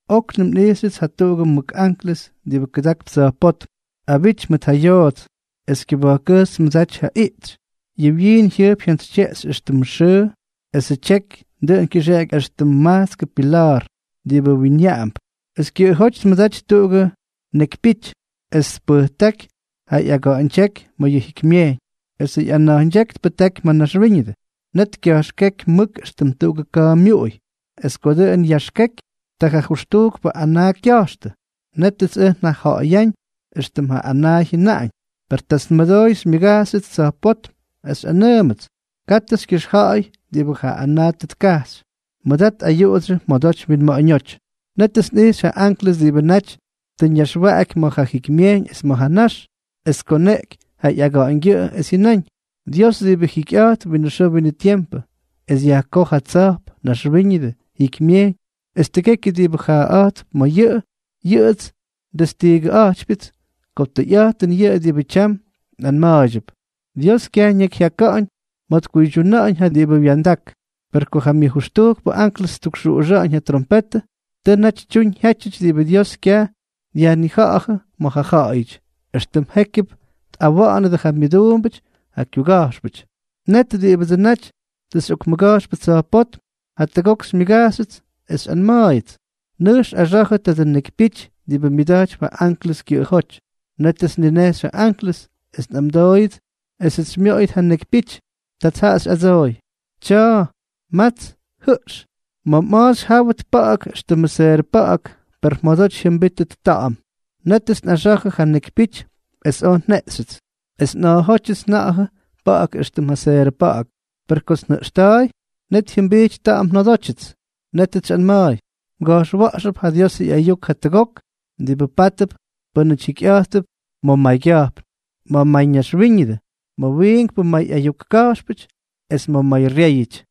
Oknʉm nꞌijxyʉts jatuꞌugʉ mʉk anklʉs diꞌibʉ kʉdakp tsa̱jpótm, abity mʉt ja yoots. Es kyʉba̱jkkʉjxy tmʉdaty ja iꞌtsy. Yʉ wyiin jyʉjp jyantsytyeꞌxy éxtʉmʉ xʉʉ, esʉ tyeky dʉꞌʉn kyʉxeꞌeky éxtʉm majtskʉ pila̱a̱r diꞌibʉ winyaꞌamp. Es kyʉꞌʉjóty tmʉdaty tuꞌugʉ nekypyity. Es tpʉjtáky ja ꞌyaga̱ꞌa̱ñdyéky ma̱ yʉ jikymyejyñ, esʉ ꞌyana̱jñdyéky tpʉjtáky ma̱ naxwíñʉdʉ. Net kya̱jxkéky mʉk éxtʉm tuꞌugʉ ka̱a̱ myuꞌuy. Es ko dʉꞌʉn yaxkeky, ta ja jʉxtujkpʉ anaa kya̱jxtʉ. Nétʉts ʉj njaja̱ꞌa̱yáñ éxtʉm ja anaa jyʉnáñ. Per tats nmʉdooy xymyʉgajxyʉts tsa̱jpótm, es xyꞌanʉʉmʉts: —Katʉ xykyʉxja̱ꞌa̱y diꞌibʉ ja anaa tʉ tkajxy. Mʉdat ayuꞌudsyʉ mjodoty mwinma̱ꞌa̱ñóty. Nétʉts nꞌijxy ja anklʉs diꞌibʉ naty tʉ ñaxwaꞌaky ma̱ ja jikymyejyñ es ma̱ ja nax, es tkoneꞌky ja ꞌyaga̱ꞌa̱ñgyʉꞌʉ, es jyʉnáñ: —Dios diꞌibʉ jikyꞌa̱jtp winʉ xʉʉ winʉ tiempʉ, es yajkoj ja tsa̱jp, naxwíñʉdʉ, jikymyejyñ, es tʉgekyʉ diꞌibʉ jaaꞌa̱jtp ma̱ yʉꞌʉ, yʉꞌʉts ndestiigʉꞌa̱jtypyʉts ko tʉyꞌa̱jtʉn yʉꞌʉ diꞌibʉ tyam nꞌanma̱a̱ydyʉp. Dios kyaj ñakyjyaka̱ꞌa̱ñ ma̱ tkuydyuna̱ꞌa̱ñ ja diꞌibʉ wya̱ndak. Per ko ja myʉjʉxtujkpʉ anklʉs ttukxuꞌuxa̱ꞌa̱ñ ja trompetʉ, tʉ naty tyuñ jyátyʉty diꞌibʉ Dios kyaj dyajnija̱ꞌa̱jʉ ma̱ ja ja̱ꞌa̱yʉty, éxtʉm jékyʉp tꞌawa̱ꞌa̱nʉdʉ ja myʉduumbʉty, ja kyuga̱jxpʉty. Net diꞌibʉdsʉ naty tʉ xyꞌokmʉga̱jxpʉ tsa̱jpótm, jatʉgok xymyʉgajxyʉts, es xyꞌanma̱a̱yʉts: —Nʉjx axa̱jʉ tadʉ nekypyity diꞌibʉ myʉda̱jtypy ja anklʉs kyʉꞌʉjóty. Nétʉts nninejxy ja anklʉs, es nꞌamdooyʉts esʉts xymyoꞌoyʉt ja nekypyity. Tats jaꞌa xyꞌadsooy: —Tya̱a̱, mats, jʉꞌx. Ma̱ mꞌa̱a̱ xyjáwʉt pa̱ꞌa̱k éxtʉmʉ seerʉ pa̱ꞌa̱k, per mjodoty jyʉmbítʉt ta̱ꞌa̱m. Nétʉts nꞌaxa̱jʉ ja nekypyity, es oj njeꞌxyʉts. Es nꞌa̱a̱jótyʉts nja̱ꞌa̱jʉ pa̱ꞌa̱k éxtʉmʉ seerʉ pa̱ꞌa̱k, per kots njʉꞌxta̱a̱y, net jyʉmbijty ta̱ꞌa̱m njodótyʉts. Nétʉts xyꞌanma̱a̱y: —Mga̱jxwa̱ꞌxʉp ja Diosʉ ꞌyayuk jatʉgok diꞌibʉ pátʉp pʉ́nʉty jikyꞌa̱jttʉp ma̱ maygya̱jpn, ma̱ mayñaxwíñʉdʉ, ma̱ wiinkpʉ may ayuk ka̱jxpʉty, es ma̱ mayryéyʉty.